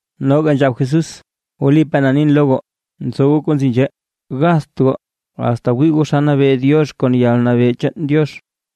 Noga nzhab Jesús: ―Wlipaa na nin lo goo, nzo goo kuu nzi nzhee, gatht goo asta wii goo naa xa nabee Diox, kon yalnabee chaan Diox.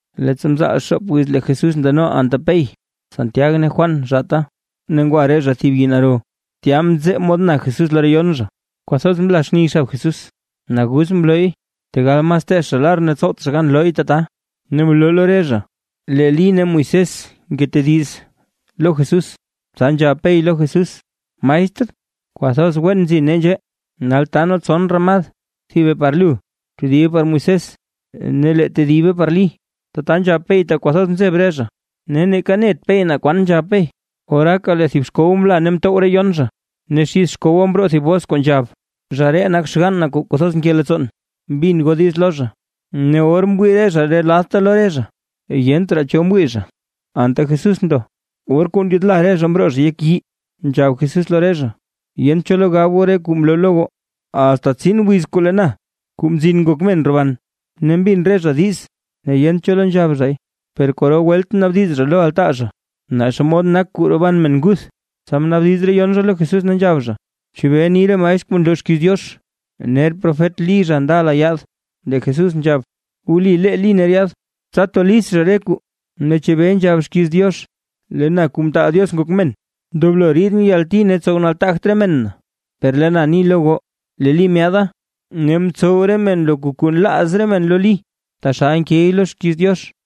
Leettsa mzaal xoop wiz lee Jesús ndano anta Pey, Santiag ne Juan zhaata, ne ngwa re zha thib yii naro, tya mzee mod na Jesús lo re yon zha. Kwathoz mla xni xab Jesús, naguz mlooy, tegal mas teech zha lar, ne tsowt zha gan looy tata. Ne mloo lo re zha lee Lí ne Moisés ngetediz lo Jesús. Tsa nzhab Pey lo Jesús: ―Maestr, kwathoz wen nzi nee nzhee; nal taa nee tson ramad, thibe par lu, tedibe par Moisés ne lee tedibe par Lí. Tata nzhab Pey tak kwathoz mzeb re zha, ne neeka net Pey naa kwan nzhab Pey. Ne oraaka lee thib xkow mla ne mtow re yon zha, ne xid xkowa mroo thib bos kuu nzhab: ―Zha ree nak xgann na kuu kwathoz nke leettsoon, bin goo diiz lo zha. Ne or mwii re zha re ladta lo re zha, yent raa cho mwii zha, anta Jesús ndo. Or kuu ndyaadla re zha mroo zha yek yii, tsa nzhab Jesús lo re zha: ―Yent cho lo gab goo re kuu mloo lo goo, asta tsin wiz kuu lee na, Kuu Mzin Ngok Men roban. Ne mbin re zha diiz, ne yent cho lo nzhab zhay, per kwaro welt naabdiz zha lo altaa zha, naa xomod nak kuu roban men nguth. Tsa mnaabdiz re yon zha lo Jesús ne nzhab zha: ―¿Chebee ni re maestr kuu nloo xkiiz Diox, ner profet Lí zha ndala yaad? Lee Jesús nzhab: ―Wli lee Lí ner yaad, tsa to list zha re kwaa. Ne ¿chebee nzhab xkiiz Diox: “Lee na Kuu Mtaal Diox Ngok Men, ndoblo ridʼn yalti ne tsow nataagt re men na”? Per lee na ni lo goo, lee Lí myaada ne mtsow re men loka kuu nlaaz re men lo Lí, taxal nkey lo xkiiz Diox.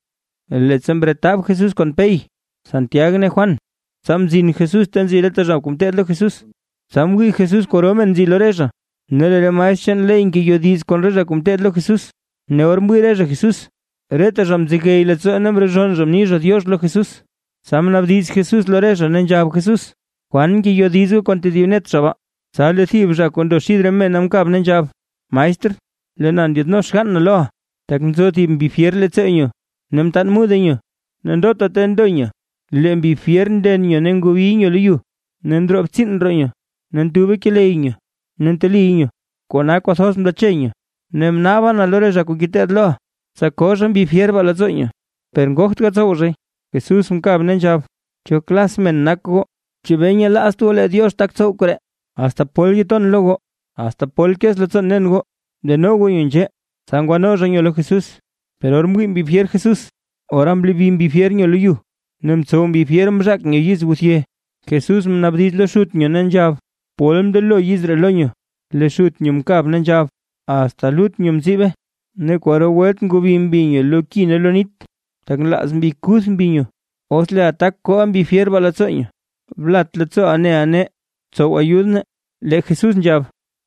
Leettsa mretab Jesús kon Pey, Santiag ne Juan, tsa mzin Jesús ta nzi reta zha kuu ngeteed lo Jesús, tsa mwii Jesús kwaro men nzi lo re zha, ne lee re maestr chaan ley ngeyodiz kon re zha kuu ngeteed lo Jesús. Ne or mwii re zha Jesús, reta zha mzegey leettsoo ne mrezhonn zha mni zha “diox” lo Jesús. Tsa mnaabdiz Jesús lo re zha, ne nzhab Jesús: ―¿Kwan ngeyodiz goo kon tedib net zha baa? Tsa lee thib zha kuu ndo xid re mena mkab ne nzhab: ―Maestr, lee na ndyaadno xgann na loʼa, tak nzo thib mbi fyer leettsoo nyo, ne mtaan mude nyo. Ndota ta ndo nyo lee mbi fyer nden nyo ne ngobiy nyo lo yu; ne ntsowe ndroo btsiin roo nyo ne ntube keley nyo ne nteliy nyo. Kona kwathoz mlache nyo. Ne mnaaba na lo re zha kuu ngeteed loʼa, tsa koo zha mbi fyer baa leettsoo nyo, per ngogt gatsow zhay. Jesús mkab ne nzhab: ―¡Cho klas men nak goo! ¿Chebee nyelaazt goo lee Diox tak tsow koree? ¿Asta pol ton lo goo? ¿Asta pol kez leettsoon nen goo? Deno goo nyo nzhee. Tsa ngwano zha nyo lo Jesús, per or mwii mbi fyer Jesús, ora mlobi mbi fyer nyo lo yu ne mtsow mbi fyer mzhaak nyo yizguthye. Jesús mnaabdiz lo xut nyo ne nzhab: ―¿Pol mndelo yiz ree lo nyo? Lee xut nyo mkab ne nzhab: ―Asta lut nyo mziibe. Ne kwaro welt ngobi mbi nyo lo ki ne lo nit, tak nlaaz mbi kuth mbi nyo, os leeʼa tak kooʼa mbi fyer baa leettsoo nyo, blat leettsooʼa neʼa nee, btsow ayud nee. Lee Jesús nzhab: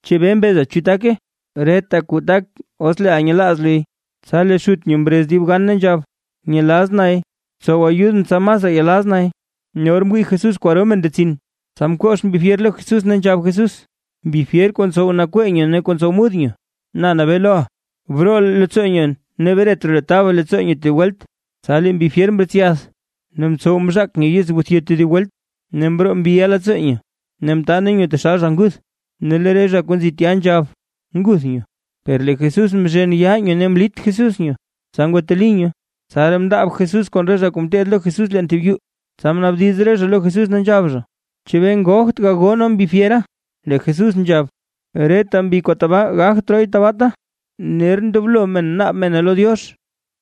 ―¿Chebee mbeza chu take? ¡Reta kuu tak, os leeʼa nyelaaz luy! Tsa lee xut nyo mrez dib gan ne nzhab: ―Nyelaz nay, btsow ayudʼn tsa masraa yelaz nay. Ne or mwii Jesús kwaro men ndetsin, tsa mkox mbi fyer lo Jesús ne nzhab Jesús: ―Mbi fyer kuu ntsow nakwee nyo ne kuu tsow mud nyo. Na nabee loʼa, broo leettsoo nyo ne bret raa lu taba leettsoo nyo tedib welt. Tsa lee mbi fyer mretsyath ne mtsow mzhaak nyo yizguthye tedib welt, ne mroo mbiʼa leettsoo nyo ne mtaane nyo taxal zha nguth. Ne lee re zha kuu nzi tya nzhab: ―Nguth nyo. Per lee Jesús mzhen yaa nyo ne mlit Jesús nyo, tsa ngwateli nyo. Tsaraa mndaab Jesús kon re zha kuu ngeteed lo Jesús leen thib yuu, tsa mnaabdiz re zha lo Jesús, ne nzhab zha: ―¿Chebee ngogt gagoo nee mbi fyera? Lee Jesús nzhab: ―Reta mbi kuu tabaa gagt rooy tabaata, ner ndoblo naab mene lo Diox.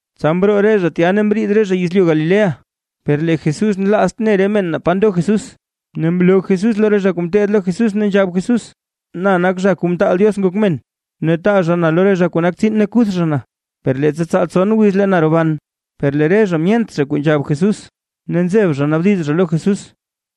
Tsa mroo re zha tya ne mriid zha yezlyu Galilea. Per lee Jesús nlaazt ne re men naa pa ndo Jesús. Ne mloo Jesús lo re zha kuu ngeteed lo Jesús, ne nzhab Jesús: ―Na nak Zha Kuu mtaal Diox Ngok Men, ne taa zha na lo re zha kuu nak tsiin ne kuth zha na, per leettsa tsaal tson wiz lee na roban. Per lee re zha myent zha kuu nzhab Jesús, ne nzeb zha naabdiz zha lo Jesús.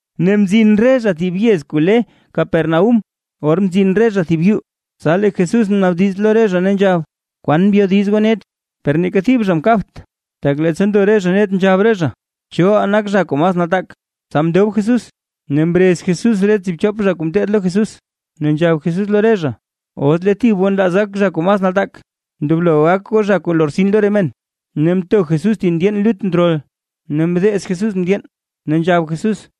Ne mzin re zha thib yez kuu le Capernaúm, or mzin re zha thib yuu. Tsa lee Jesús mnaabdiz lo re zha, ne nzhab: ―¿Kwaan mbyodiz goo net? Per neeka thib zha mkabt, tak leettsa ndo re zha net nzhab re zha: “¿Choʼaa nak zha kuu mas nataak?” Tsa mndob Jesús ne mrez Jesús re tsiibchop zha kuu ngeteed lo Jesús, ne nzhab Jesús lo re zha: ―Os lee thib goo nlaaz gak zha kuu mas nataak, ndoblo gak goo zha kuu lortsin lo re men. Ne mto Jesús thib ndyeen lut ndrol, ne mdeez Jesús ndyeen, ne nzhab Jesús: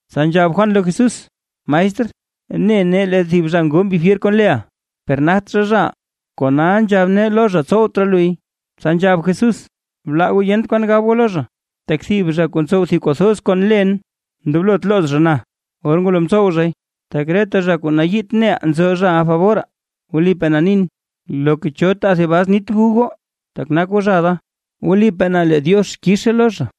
Tsa nzhab Juan lo Jesús: ―Maestr, ne nee lee thib zha ngoo mbi fyer kon leʼa, per nagt zha, zhaʼaa, kona nzhab nee lo zha: “Tsowt raa luy”. Tsa nzhab Jesús: ―Blaa goo yent kwan gab goo lo zha. Tak thib zha kuu ntsow thib kuu thoz kon len, ndoblot looz zha na, or ngwalo mtsow zhay. Tak reta zha kuu nayiit neʼaa nzo zhaʼa faboraa. Wlipaa na nin, loka cho taa thib bas nit gu goo, tak nak goo zha da, wlipaa na lee Diox kizhe lo zha.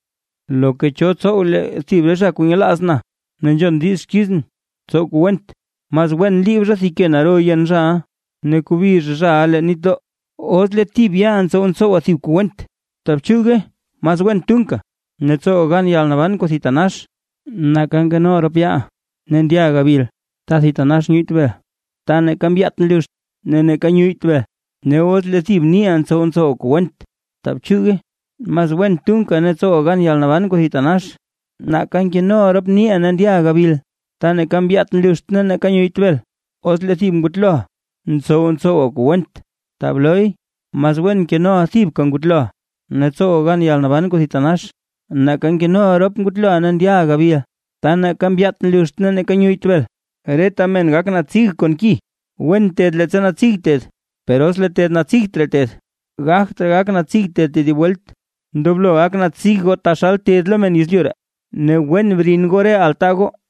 ’Loka cho tsow lee thib re zha kuu nyelaaz na ne nzhon diiz xkizʼn tsow kuu went, mas wen liib zha thib ke naro yen zhaʼa ne kobi zha zhaʼa leen nitdoo. Os lee thib yaaʼa ntsow ntsowa thib kuu went, ta bchuuge mas wen tunka ne tsowa gan yalnaban kuu thitanax, nake nkenoʼa rop yaaʼa ne ndyaʼa gabil ta thitanax nyuyyt bel, ta neeka mbyaat nluxt, ne neeka nyuyyt bel. Ne os lee thib niiʼa ntsow ntsowa kuu went taa bchuuge, mas wen tunka ne tsowa gan yalnaban kuu thitanax, nake nkenoʼa rop niiʼa ne ndyaʼa gabil. Ta neeka mbyaat nluxt ne neeka nyuyyt bel. Os lee thib ngutloʼa, ntsow ntsowa kuu went, taa blooy mas wen nkenoʼa thibka ngutloʼa ne tsowa gan yalnaban kuu thitanax, nake nkenoʼa rop ngutloʼa ne ndyaʼa gabil, ta neeka mbyaat nluxt ne neeka nyuyyt bel. ’Reta men gak natsig kon ki. Wen ted leettsa natsig ted, per os lee ted natsigt raa ted, gagt raa gak natsig ted tedib welt, ndoblo gak natsig goo taxal ted lo re men yezlyu ree, ne wen brin goo re altaa goo.